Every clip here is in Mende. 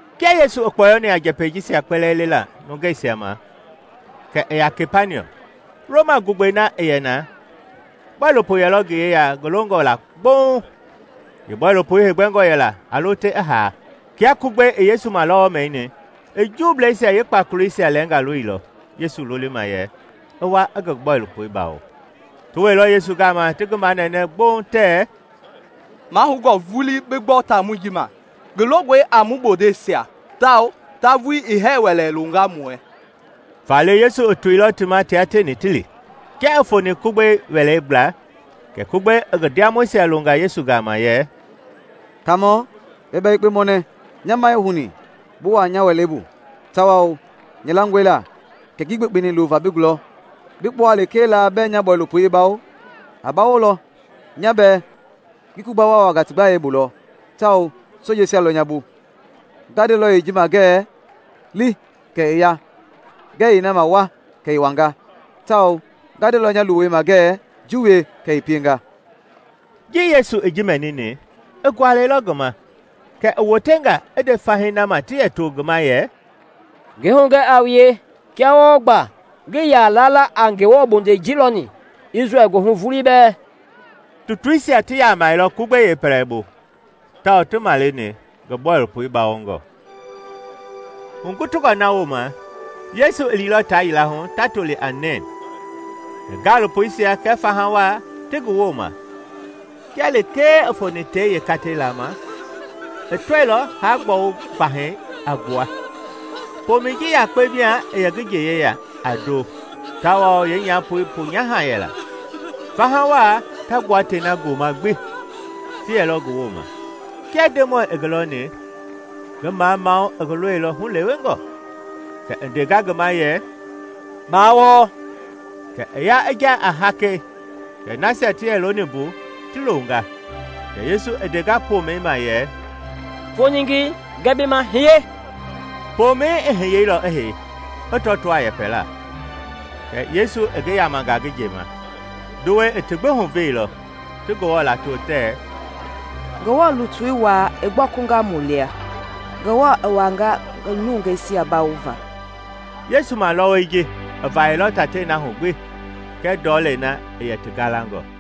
Kia Yesu i kpɔɔyɔni a njɛpɛi jisia kpɛlɛɛ lela nungeisia ma kɛ i ya Kapaniɔm. Roma gugbɛi na i yɛ na, bɔilopo yɛlɔ ngi yeya ngi longɔ la gbouŋ; yeebɔilopoi heegbɛngɔ yɛla a lo te i haa. Kia Kugbei i Yesu malɔwɔi mɛnini, i Juubleisia yee kpakoleisia lɛɛnga loilɔ Yesu lolima yɛ i wa i ngi bɔilopoi bawo. Ti wɛilɔ Yesu gama ti ngi manɛnɛ gbouŋ tɛɛ; “Mahoungɔ vulii bi gbɔ taamɔi ji ma. Ngi longɔe a mu bondeisia tawao ta vulii i hɛɛ wɛlɛ longa mu wɛɛ.” Faale Yesu i toilɔ ti ma tia tieni ti li. Kia i foni Kugbei wɛlei gbla, kɛ Kugbei i ngi ndiamɔisia longa Yesu gama yɛ, “Kaamɔ, ba bia yekpe mɔnɛ. Nya ma ii houni bi wua nya wɛlei bu, tawao nya langɔe la kɛ ngii gbekpeni lova bi gulɔ. Bia kpua lekee la bɛɛ nya bɔilopoi i bawo, a bawolɔ. Nya bɛɛ ngi Kugba waawangaa ti gbayei bu lɔ tawao sojeisia lɔ nya bu. Nga ndelɔ yeeji ma ngɛɛ ‘Li’ kɛ i ya; ngɛɛ yeena ma ‘Wa!’ kɛ i wanga; tawao nga ndelɔ nya luwei ma ngɛɛ ‘Ji wie!’ kɛ i pienga.” Ji Yesu i ji mɛnini, i gualɛilɔ ngi ma; kɛ i wotenga i nde fahii na ma ti yɛ to ngi ma yɛ, “Ngi hugɛ a wue, kia wɔɔ gba ngii ya lala a Ngewɔ bondei ji lɔni, Isrɛl goohu vulii bɛɛ!” Tutuisia ti yamɛilɔ Kugbei yeepɛlɛbu tawao ti maleni ngi bɔilopoi bawongɔ. Hugutungɔ na wooma, Yesu i liilɔ taa yila hu ta toli a Neen, ngi gaalopoisia kɛɛ faha wa ti ngi wooma. Kia lekee i foni tei yeekatei lama, i tɔilɔ haa-gbɔwu vahɛi a gbua. Pomɛi ji yakpe mia i yɛ ngi nje yeya a ndo tawao yeenyapoi ponyaha yɛla; faha wa ta gbua tei na gooma gbi ti yɛlɔ ngi woma. Kia Ndemɔi i ngi lɔni, ngi mamamau i ngi lɔilɔ hulewengɔ, kɛ i ndenga ngi ma yɛ, “Baa wɔɔ.” Kɛ i ya i ja a hakei, kɛ nasia ti yɛ looni mbu ti longa. Kɛ Yesu i ndenga pomɛi ma yɛ, “Foningei! Ngɛɛ bi ma, hiye!” Pomɛi i hiyeilɔ i hei, i tɔtoo a yɛpɛlaa, kɛ Yesu i ngi yamanga ngi nje ma. Nduwɛi i ti gbi huveilɔ, ti Ngewɔ lato tɛɛ, “Ngewɔ lutui wa i gbɔkunga mu lia! Ngewɔ i wanga ngi nungeisia bawova!” Yesu malɔwɔi ji i vayɛilɔ tatei na hu gbi kɛɛ ndɔlei na i yɛ ti galangɔ.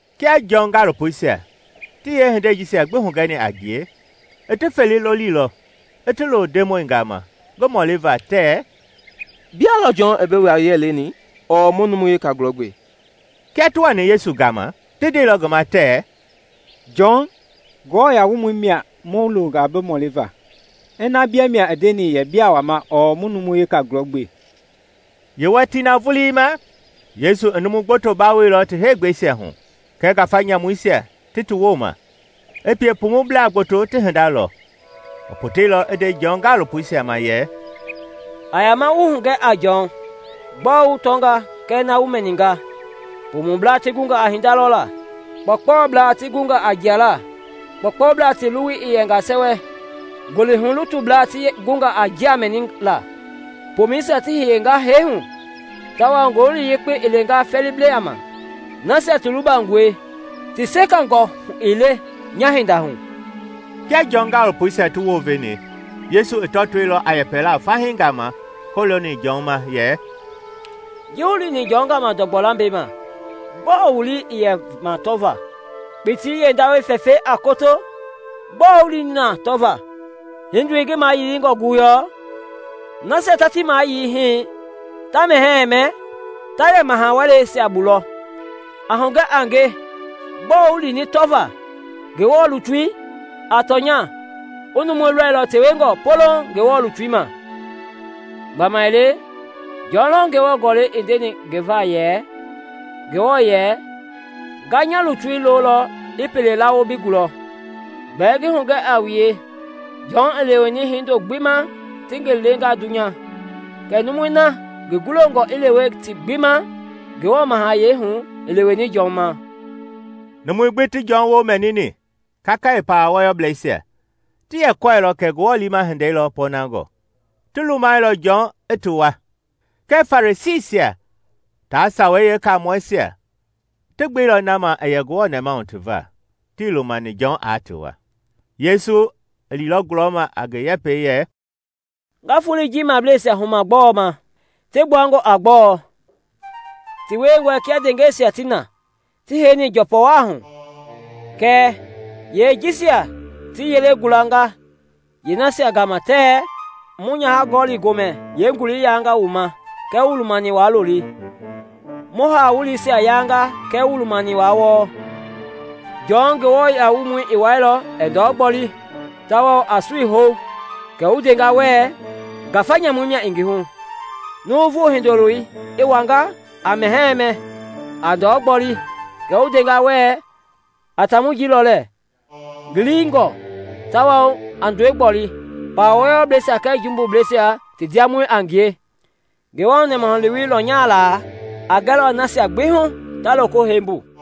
Kia Jɔn gaalopoisia ti yeehindei jisia gbi hugɛni a ngie, i ti fele lolilɔ i ti lo Ndemɔi gama ngi mɔliva tɛɛ, “Bia lɔ Jɔn i bi wa-yiɛi leni ɔɔ mu numu weka gulɔ gbe?” Kia ti wani Yesu gama, ti ndeilɔ ngi ma tɛɛ, “Jɔn, Nguamɔi mia i mu longa bi mɔliva ina bia mia i ndeni yɛ bia wama ɔɔ ina mu numu weka gulɔ gbe?” Yeewatii na vulii ma, Yesu i numu gboto bawoilɔ ti heegbɛisia hu kɛɛ ngafa nyamuisia ti ti woma, i pie pumublaa gboto ti hinda lɔ. I poteilɔ i nde Jɔn gaalopoisia ma yɛ, “A yama wu hugɛ a Jɔn gbɔɔ wu tɔnga kɛɛ na wu mɛninga: pumublaa ti gunga a hinda lɔla, kpɔɔkpɔbla ti gunga a jiala, kpɔukpɔubla ti luwui i yɛnga sɛwɛ, ngolihu-lutubla ti gunga a njia mɛnila, pomɛisia ti hiyenga hɛi hu, tawao Ngowili Yekpei i lenga fɛɛlibla ma. Nasia ti lubangɔe ti sekangɔ ii le nya-hinda hu!” Kia Jɔn gaalopoisia ti wounveni, Yesu i tɔtoilɔ a yɛpɛla fahii gama kɔlooni Jɔn ma yɛ, “Ji wu lini Jɔn gama ndɔgbɔ lambei ma, gbɔɔ wu lii i yɛ ma tɔvaa? Kpitii yeendawɛi fɛfɛi a koto? Gbɔɔ wu lini tɔvaa? Hindoi ngi mayilingɔ guyɔɔ? Nasia ta ti mayili hii, ta mɛhɛɛ mɛ, ta yɛ maha-wɛleisia bu lɔ! A hugɛ a nge, gbɔɔ wu lini tɔvaa? Ngewɔ lutui? A tɔnya, wu numu loilɔ tewengɔ poloŋ Ngewɔ lutui ma. Gbamaile Jɔn lɔ Ngewɔ Gɔlɛi i ndeni ngi va yɛ, ‘Ngewɔ yɛ, Nga nya lutui lolɔ i pelei lawo bi gulɔ.’ Gbɛɛ ngi hugɛ a wue, Jɔn i leweni hindo gbi ma ti ngi lenga dunya. Kɛɛ numui na ngi gulongɔ i lewe ti gbi ma Ngewɔ mahayɛi hu i leweni Jɔn ma.” Numui gbi ti Jɔn woo mɛnini, kakaye pawa wɔyɔblɛisia, ti yɛ kɔɛilɔ kɛ Ngewɔ liima hindei lɔ pɔɔnangɔ, ti lumai lɔ Jɔn i ti wua. Kɛɛ Farisiisia tia Sawei Yeekamɔɛisia ti gbeilɔ na ma i yɛ Ngewɔ nɛmahu ti va, tii lumani Jɔn aa ti wua. Yesu i liilɔ gulɔma a ngi yɛpɛi yɛ, “Nga foloi ji mableisia huma gbɔɔ ma? Ti gbuangɔ a gbɔɔ? Ti wiengɔe kia ndeengɛisia ti na, ti heini njɔpɔwahu. Kɛ yeejisia ti yelei gulanga yeenasia gama tɛɛ, ‘Mu nyaha- gɔli-gomɛi yeengulei yanga wu ma kɛɛ wuii lumani wa looli! Mu haa-wuleisia yanga kɛɛ wuii lumani wa wɔɔ!’ Jɔn, Nguamɔi, i wɛilɔ, ɛɛ ndɔ gboli tawao a sui hou, kɛ wu ndenga wɛɛ, ‘Ngafa nyamu mia i ngi hu!’ Nuuvu Hindoloi i wanga, a mɛhɛɛ mɛ, a ndɔ gboli, kɛ wu ndenga wɛɛ, ‘A taamɔi ji lɔ lɛɛ! Ngi liingɔ tawao a ndɔi gboli, pawa wɔyɔblɛisia kɛɛ jumbubleisia ti ndiamɔi a ngie!’ Ngewɔ nɛmahulewei lɔnyala a gɛlɔ nasia gbi hu ta loko hei mbu.”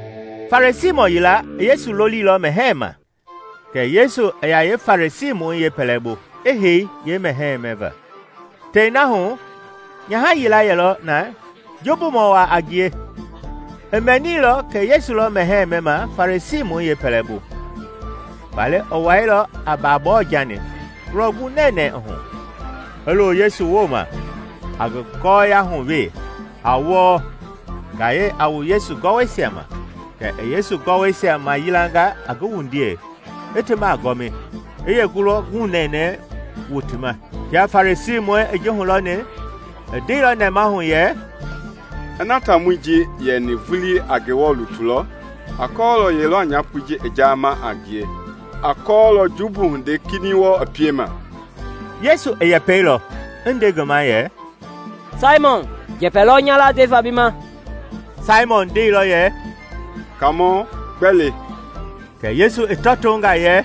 Farisiimɔ yila i Yesu lolilɔ mɛhɛɛ ma, kɛ Yesu i ya yeefarisiimɔ yeepɛlɛbu, i hei yeemɛhɛi mɛva. Tei na hu, nyaha yila yɛlɔ na jumbumɔ wa a ngie. I mɛnilɔ kɛ Yesu lɔ mɛhɛɛ mɛma Farisiimɔi yeepɛlɛbu, faale i wɛilɔ a babɔɔ-jani, ngulɔ gu nɛnɛɛ i hu, i lo Yesu wooma a ngi gɔyahuwee, a wɔɔ, ngayɛi a wu Yesu gɔwɔisia ma. Kɛ i Yesu gɔwɔisia mayilanga a ngi wundiei, i ti magɔmi, i yeengulɔ gunɛnɛ wuti ma. Kia Farisiimɔi i ji hulɔni, i ndeilɔ nɛmahu yɛ, “Ina taamɔi ji i yɛni vulii a Ngewɔ lutui lɔ, aa kɔɔlɔ ye lɔ a nyapoi ji i jaama a ngie; aa kɔɔlɔ jumbu hindei kinɛiŋ wɔɔ i piema!” Yesu i yɛpɛilɔ i nde ngi ma yɛ, “Saimɔn, njɛpɛ lɔ nya la ndeva bi ma.” Saimɔn ndeilɔ yɛ, “Kaamɔ, gbɛ le?” Kɛ Yesu i tɔtonga yɛ,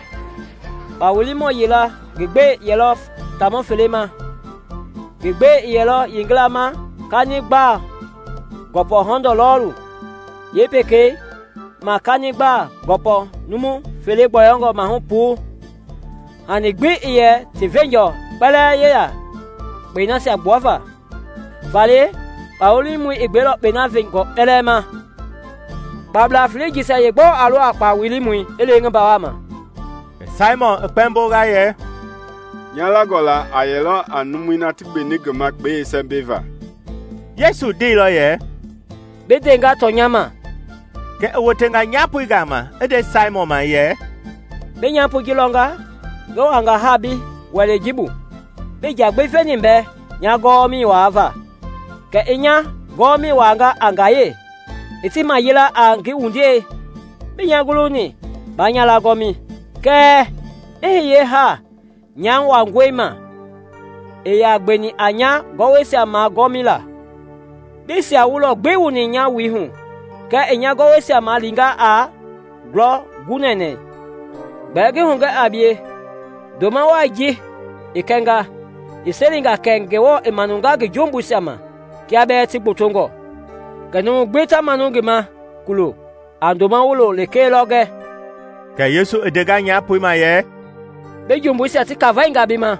“Kpa wilimɔ yila ngi gbɛi yɛlɔ taamɔ fele ma. Ngi gbɛi i yɛ yeengila ma kani gbaa gɔpɔ hɔndɔɔ lɔɔlu, i yeepekei ma kani gbaa gɔpɔ numu fele gbɔyɔngɔ mahu puu. Hani gbi ii yɛ ti veenjɔ kpɛlɛɛ yeya kpɛi nasia gbuava, faale kpa wilimɔi i gbeilɔ kpɛi na veenjɔɔ kpɛlɛɛ ma. Kpabla felei jisia yeegbɔɔ a lo a kpa wilimɔi i lewe ngi mbaa ma?” Kɛ Saimɔn i kpɛmbonga yɛ, “Nya langɔ la a yɛlɔ a numui na ti gbeni ngi ma kpɛi yeesɛmbɛi va.” Yesu ndeilɔ yɛ, “Bi ndenga tɔnya ma.” Kɛ i wotenga nyapoi gama i nde Saimɔn ma yɛ, “Bi nyapoi ji lɔnga? Ngi wuanga ha bi wɛlei ji bu, bii nja gbi veni mbɛ nya gɔwɔmɛi wuava, kɛɛ i nya gɔwɔma wuanga a ngayɛi, i ti mayilanga a ngi wundiei. Bii nya guluni ba nya lagɔmi, kɛɛ i hiye ha nya wangɔi ma ii ya gbeni a nya gɔwɔisia magɔmila. Bii sia-wulɔ gbi wuni nya wui hu kɛɛ i nya gɔwɔisia malinga a ngulɔ gunɛnɛ. Gbɛɛ ngi hugɛ a bie, ndoma wai ji i kɛnga, i selinga kɛ Ngewɔ i manunga ngi jumbuisia ma kia bɛɛ ti gbotongɔ. Kɛɛ numu gbi ta manu ngi ma kulo, a ndoma wulo lekee lɔ gɛ.” Kɛ Yesu i ndenga nyapoi ma yɛ, “Bi jumbuisia ti kafainga bi ma.”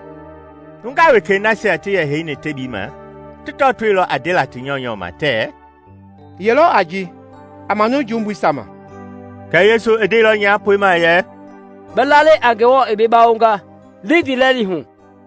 Nungaa wekei nasia ti yɛ heini tebii ma ti tɔtoilɔ a ndela ti nyɔunyɔ ma tɛɛ, “Ye lɔ a ji, a manu jumbuisia ma?” Kɛɛ Yesu i ndeilɔ nyapoi ma yɛ, “Bi lalɛi a Ngewɔ i bi bawonga; li ndiilɛli hu.”